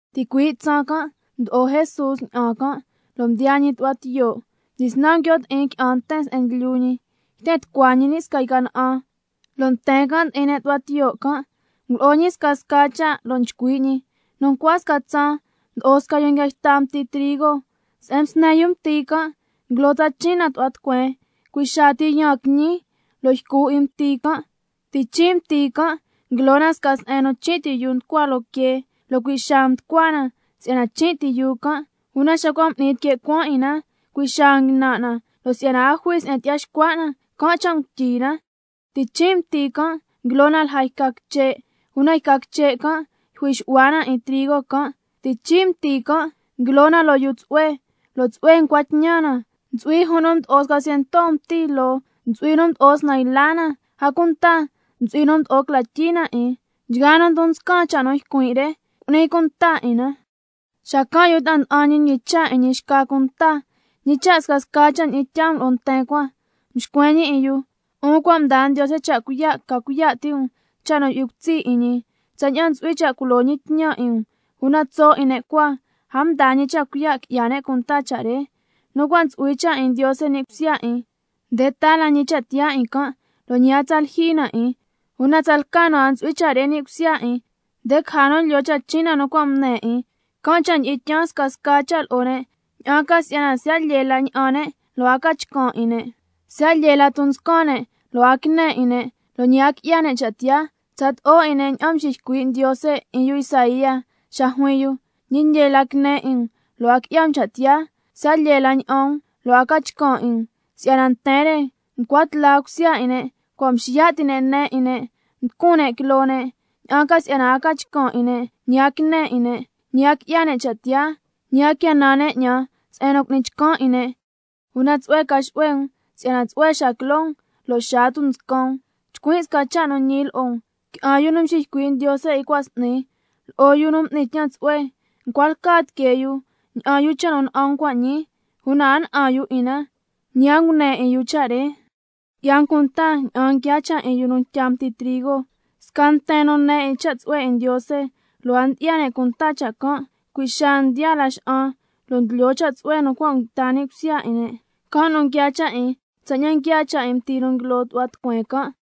Ticui' tsaan can' mdyi'o Jesús ña'an can', lo' mdiyaa ñi tu'hua tiyo'. Mdyisnan nguio' ti'in qui'an nten se'en ndlyu ñi, yten tucua ñi ni' sca yca na'an, lo' nten can' ndi'in ne' tu'hua tiyo' can', ngulo'o ñi scasca cha' lo' nchcui' ñi: Nu ncua sca tsaan mdo'o sca yu nguia yta mti trigo. Se'en msne yu mti can' nguilo tsachin' na tu'hua tucueen, cui' xaa ti yaan quiñi lo' ycu 'in mti can'. Tichin' mti can' nguilo na sca se'en nu chin' ti yuu nducua loo quee, lo' cui' xaa mducua na si'yana chin' ti yuu can', una xa cua' m'ni tique' cuaan 'in na, cui' xaa nguinan' na, lo' si'yana a jui se'en tyi'ya xcua' na, can' cha' ngutyi na. Tichin' mti can' nguilo na lja yca quiche', una yca quiche' can' yjui xu'hua na 'in trigo can'. Tichin' mti can' nguilo na loo yuu tsu'hue, lo' tsu'hue ncua tñan na: Ntsu'hui juun nu mdo'o sca ciento mti loo, ntsu'hui nu mdo'o snan yla na, a cunta ntsu'hui nu mdo'o cla tyii na 'in. Nchgaa nu ndon nscan cha' nu ycuin' re, cu'ni cunta 'in na. Xacan' yu ta'a nda'an ñi mñicha' yu 'in ñi xca cunta: ¿Ñi cha' scasca cha' ndyi'in tyaa um lo'o nten cua? Mxcuen ñi 'in yu: 'Un cua' mdaa Ndiose cha' cuiya' ca cuiya' ti' um scasca cha' nu yu'hui cutsi' 'in ñi, tsaña'an ntsu'hui cha' culo ñi tñan 'in um, una tso' nu 'in ne' cua, a mdaa ñi cha' cuiya' qui'ya ne' cunta cha' re. Nu cua' ntsu'hui cha' 'in Ndiose ni' cusya 'in, nde taa la ñi cha' tiyaa 'in can', lo' ñi a tsa lyijyi na 'in, una tsalca nu a ntsu'hui cha' re ni' cusya 'in, nde caja nu lyoo tsachin' cha' nu cua' ngune 'in. Can' cha' ndyi'in tyaan scasca cha' lo'o ne', ña'an ca si'yana siya' lyee la ña'an ne' lo' a ca chcan' 'in ne', siya' lyee la ton nscan ne' lo' a quine 'in ne', lo' ñi a qui'ya ne' cha' tiyaa. Tsato'o 'in ne' ña'an mxiycui' Ndiose 'in yu Isaía xa juin yu: —Ñi lyee la quine 'in um, lo' a qui'ya um cha' tiyaa, siya' lyee la ña'an um, lo' a ca chcan' 'in um. Si'yana nten re ncua tla cusya 'in ne', cua' mxiya' ti' ne' ne 'in ne', mducun ne' quiloo ne', ña'an ca si'yana a ca chcan' 'in ne', ñi a quine 'in ne', ñi a qui'ya ne' cha' tiyaa, ñi a quia nan ne' 'ñan se'en nu cu'nin chcan 'in ne'—. Una tsu'hue ca xu'hue um si'yana tsu'hue xaa quiloo um, lo' xaa tunscan um. Chcuin' sca cha' nu ñi lo'o um: Qui'an yu nu mxiycui' Ndiose 'in cua' s'ni, lo'o yu nu m'ni tñan tsu'hue, ncua lca tiquee yu ña'an yu cha' nu na'an um cua' ñii, una a na'an yu 'in na, ñi a ngune 'in yu cha' nu ne 'in um cua' ñii. Qui'ya um cunta ña'an nguiaa cha' 'in yu nu ntya mti trigo: Sca nten nu ne 'in cha' tsu'hue 'in Ndiose, lo' a ndyi'ya ne' cunta cha' can', cui' xaa ndyi'an laxa'an lo' ndlyoo cha' tsu'hue nu cua' nguita ni' cusya 'in ne'. Can' nu nguiaa cha' 'in tsaña'an nguiaa cha' 'in mti nu nguilo tu'hua tucueen can'.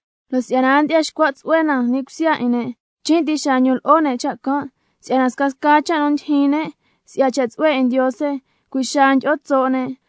Lo' si'yana a ndyi'ya xcua' tsu'hue na ni' cusya 'in ne', chin' ti xaa ndon lo'o ne' cha' can', si'ya scasca cha' nu ndyijyin ne' si'ya cha' tsu'hue 'in Ndiose, cui' xaa ndyi'o tso' ne'.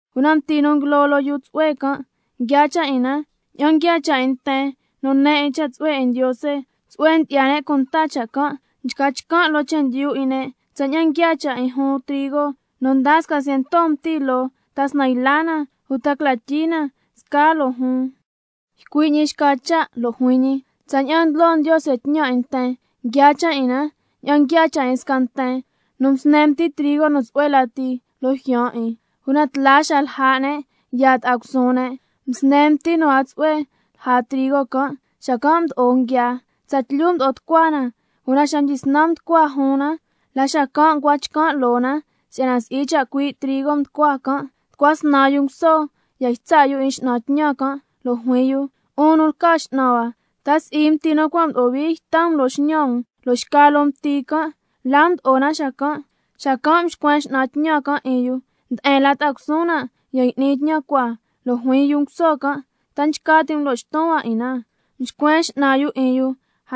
Una mti nguilo loo yuu nu tsu'hue can', nguiaa cha' 'in na tsaña'an nguiaa cha' 'in nten nu ne 'in cha' tsu'hue 'in Ndiose, tsu'hue ndyi'ya ne' cunta cha' can', nchca chcan' loo chendyu 'in ne' tsaña'an nguiaa cha' 'in juun trigo nu ndaa sca ciento mti loo, ta snan yla na, uta cla tyii na scaa loo juun. Ycui' ñi xca cha' lo' juin ñi: Tsaña'an ndlo Ndiose tñan 'in nten, nguiaa cha' 'in na tsaña'an nguiaa cha' 'in sca nten nu msne mti trigo nu tsu'hue lati loo jyaan 'in, una tla xa lja' ne' yaa ta'a cusuun ne', msne mti nu a tsu'hue lja trigo can', xacan' mdo'o nguiaa. Tsatlyu mdo'o tucua na, una xa mdyisnan mducua juun na, la xacan' ncua chcan' loo na si'yana si'i chacui' trigo nducua can'. Tucua snan yu nguso ya ytsa' yu 'in x'nan tñan can', lo' juin yu: 'Un nu lca x'nan hua, ¿ta si'i mti nu cua' mdo'o hui yta um loo x'ñan um? Lo' xca loo mti can', ¿la mdo'o na xacan'? Xacan' mxcuen x'nan tñan can' 'in yu: Nde'en la ta'a cusuun na ya y'ni tñan cua. Lo' juin yu nguso can': ¿Ta nchca ti' um lo' xton hua 'in na? Mxcuen x'nan yu 'in yu: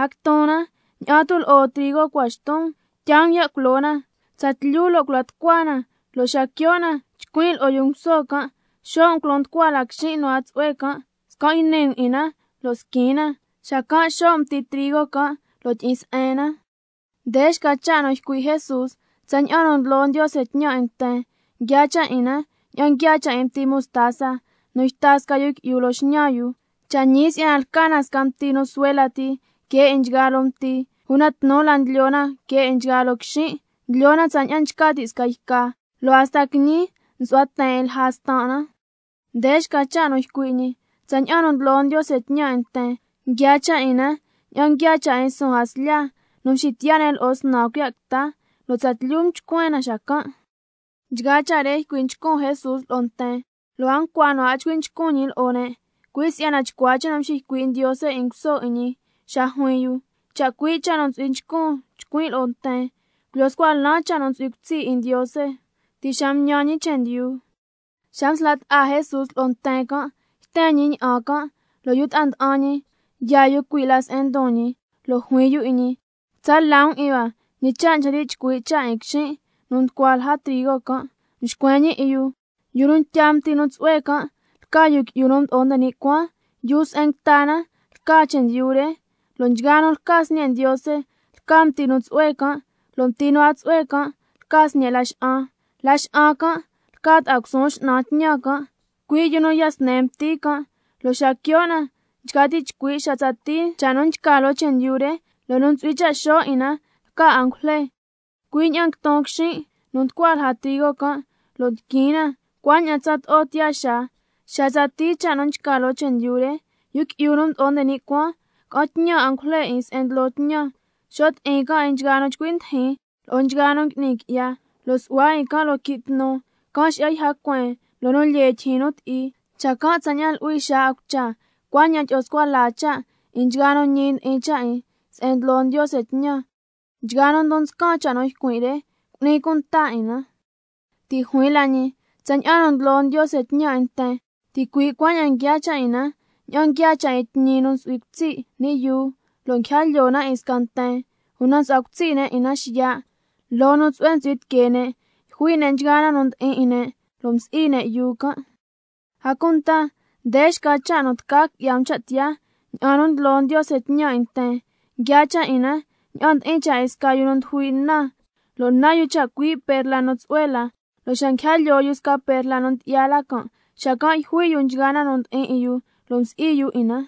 A quiton na, ña'an tu' lo'o trigo cua xton um. Tyaa um ya' culo na tsatlyu lo' cula tucua na, lo' xa quio' na chcuin' lo'o yu nguso can': Xo' um culo nducua la quixin' nu a tsu'hue can', scan' yni um 'in na lo' squin na, xacan' xo' um mti trigo can' lo' tyi'in se'en na. Nde xca cha' nu ycui' Jesús: Tsaña'an nu ndlo Ndiose tñan 'in nten, nguiaa cha' 'in na tsaña'an nguiaa cha' 'in mti mostaza nu yta sca yu qui'yu loo x'ñan yu. Cha' ñi si'yana lca na sca mti nu suhue lati que 'in nchgaa loo mti, una tnu la ndlyo na que 'in nchgaa loo quixin', ndlyo na tsaña'an nchca ti' sca yca, lo' hasta quiñi nsu'hua ten 'in lja stan' na. Nde xca cha' nu ycui' ñi: Tsaña'an nu ndlo Ndiose tñan 'in nten, nguiaa cha' 'in na tsaña'an nguiaa cha' 'in suun jaslya nu mxitiya' ne' lo'o snan cuiya' quita, lo' tsatlyu mchcuen na xacan'. Nchgaa cha' re ycui' nchcun Jesús lo'o nten, lo' a ncua nu a chcui' nchcun ñi lo'o ne', cui' si'yana chcua cha' nu mxiycui' Ndiose 'in nguso 'in ñi xa juin yu: —Chacui' cha' nu ntsu'hui nchcun chcuin' lo'o nten, culyo scua lan cha' nu ntsu'hui cutsi' 'in Ndiose ti' xa mtñan ñi chendyu—. Xa msla' ta'a Jesús lo'o nten can' yten ñi ña'an can', lo' yu ta'a nda'an ñi yaa yu cui' la se'en ndon ñi, lo' juin yu 'in ñi: Cu'ni um cha' tsu'hue quitsa' la um 'in hua ñi cha' nchca ti' chcui' cha' 'in quixin' nu mducua lja trigo can'. Mxcuen ñi 'in yu: Yu nu ntya mti nu tsu'hue can' lca Yu Qui'yu nu Mdo'o nde ni' Cuaan. Yuu se'en nguita na lca na chendyu re, lo' nchgaa nu lca sñe' Ndiose lca mti nu tsu'hue can', lo' mti nu a tsu'hue can' lca sñe' laxa'an. Laxa'an can' lca ta'a cusuun x'nan tñan can', cui' nu ya sne mti can', lo' xa quio' na nchca ti' chcui' xa tsatii cha' nu nchca loo chendyu re, lo' nu ntsu'hui cha' xo' 'in na lca angujle. Cui' ña'an nguiton quixin' nu nducua lja trigo can' lo' ndiquin na, cuaña'an tsato'o tiyaa xaa xa tsatii cha' nu nchca loo chendyu re. Yu Qui'yu nu Mdo'o nde ni' Cuaan ca'an tñan angujle 'in se'en ndlo tñan, xo' ti'in can' 'in nchgaa nu nchcui ndijin lo'o nchgaa nu ngui'ni qui'ya, lo' su'hua 'in can' loo quii' tnu, can' xi'ya yja cueen loo nu lyee tyijyin nu ti'i. Xacan' tsaña'an luhui xaa 'in cucha, cuaña'an tyi'o scua la cha' 'in nchgaa nu ñi ndi'in cha' 'in se'en ndlo Ndiose tñan. Nchgaa nu ndon nscan cha' nu ycuin' re, cu'ni cunta 'in na. Ti' juin la ñi: Tsaña'an nu ndlo Ndiose tñan 'in nten, ticui' cuaña'an nguiaa cha' 'in na tsaña'an nguiaa cha' 'in tñi nu ntsu'hui cutsi' ni' yuu, lo' nguija lyoo na 'in sca nten, una msu'hua cutsi' ne' 'in na xiya'. Loo nu tsu'hue ntsu'hui tiquee ne' yjui' ne' nchgaa na nu ndi'in 'in ne' lo' msi'i ne' yuu can'. A cunta nde xca cha' nu tca qui'ya um cha' tiyaa tsaña'an nu ndlo Ndiose tñan 'in nten, nguiaa cha' 'in na tsaña'an ndi'in cha' 'in sca yu nu ndujui' na, lo' nan yu chacui' perla nu tsu'hue la, lo' xa nguija lyoo yu sca perla nu ndyi'ya la can', xacan' yjui' yu nchgaa na nu ndi'in 'in yu lo' msi'i yu 'in na.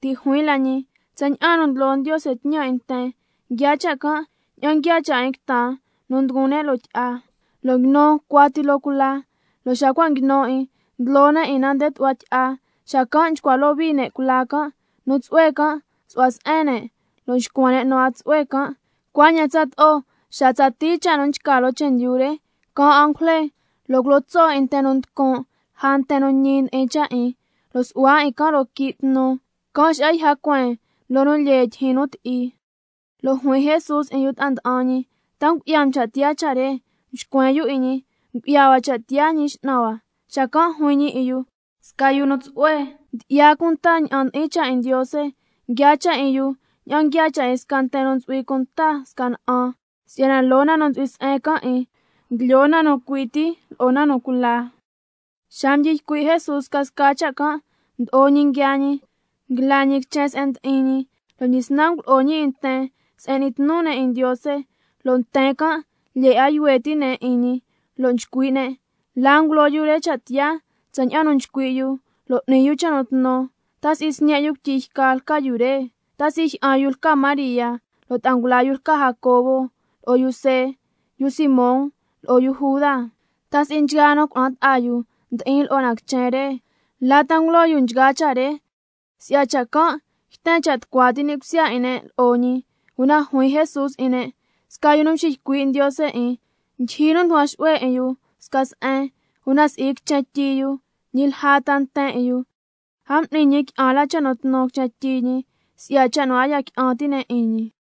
Ti' juin la ñi: Tsaña'an nu ndlo Ndiose tñan 'in nten, nguiaa cha' can' tsaña'an nguiaa cha' 'in quitan nu nduguun ne' loo tyi'a, lo' nguinu cuati loo cula, lo' xa cua' nguinu 'in, ndlyoo ne' 'in na nde tu'hua tyi'a, xacan' nchcua lyohui ne' cula can', nu tsu'hue can' nxu'hua se'en ne', lo' nxcuan ne' nu a tsu'hue can'. Cuaña'an tsato'o xa tsatii cha' nu nchca loo chendyu re, caan angujle lo' culo tso' 'in nten nu nducun' lja nten nu ñi ndi'in cha' 'in, lo' su'hua 'in can' loo quii' tnu, can' xi'ya yja cueen loo nu lyee tyijyin nu ti'i. Lo' juin Jesús 'in yu ta'a nda'an ñi: ¿Ta ngu'ya um cha' tiyaa cha' re? Mxcuen yu 'in ñi: Ngu'ya hua cha' tiyaa Ñi X'nan hua. Xacan' juin ñi 'in yu: Sca yu nu tsu'hue ndyi'ya cunta ña'an ndi'in cha' 'in Ndiose, nguiaa cha' 'in yu tsaña'an nguiaa cha' 'in sca nten nu ntsu'hui cunta sca na'an, si'yana loo na nu ntsu'hui se'en can' 'in, ndlyoo na nu cui ti lo'o na nu cula. Xa mdyi ycui' Jesús scasca cha' can', mdo'o ñi nguiaa ñi, nguila ñi quichen se'en mdi'in ñi, lo' mdyisnan ngulo'o ñi 'in nten se'en n'ni tnu ne' 'in Ndiose, lo' nten can' lyee 'a yuhue ti' ne' 'in ñi lo' nchcui' ne': ¿La ngulo yu re cha' tiyaa tsaña'an nu nchcui' yu lo' n'ni yu cha' nu tnu? ¿Ta si'i sñe' yu cuityi yca ca lca yu re? ¿Ta si'i jyi'an yu lca María, lo' ta'a ngula yu lca Jacobo, lo'o yu See, yu Simón lo'o yu Juda? ¿Ta si'i nchgaa nu cuna'an ta'a ngula yu ndi'in lo'o na quichen re? ¿La ta ngulo yu nchgaa cha' re? Si'ya cha' can' yten cha' tucua ti' ni' cusya 'in ne' lo'o ñi. Una juin Jesús lo'o ne': Sca yu nu nxiycui' Ndiose 'in ndyijyi nu nducuan xu'hue 'in yu xca se'en, una si'i quichen tyi yu uta lja ta nten 'in yu. A m'ni ñi qui'an la cha' nu tnu quichen tyi ñi, si'ya cha' nu a ya qui'an ti' ne' 'in ñi.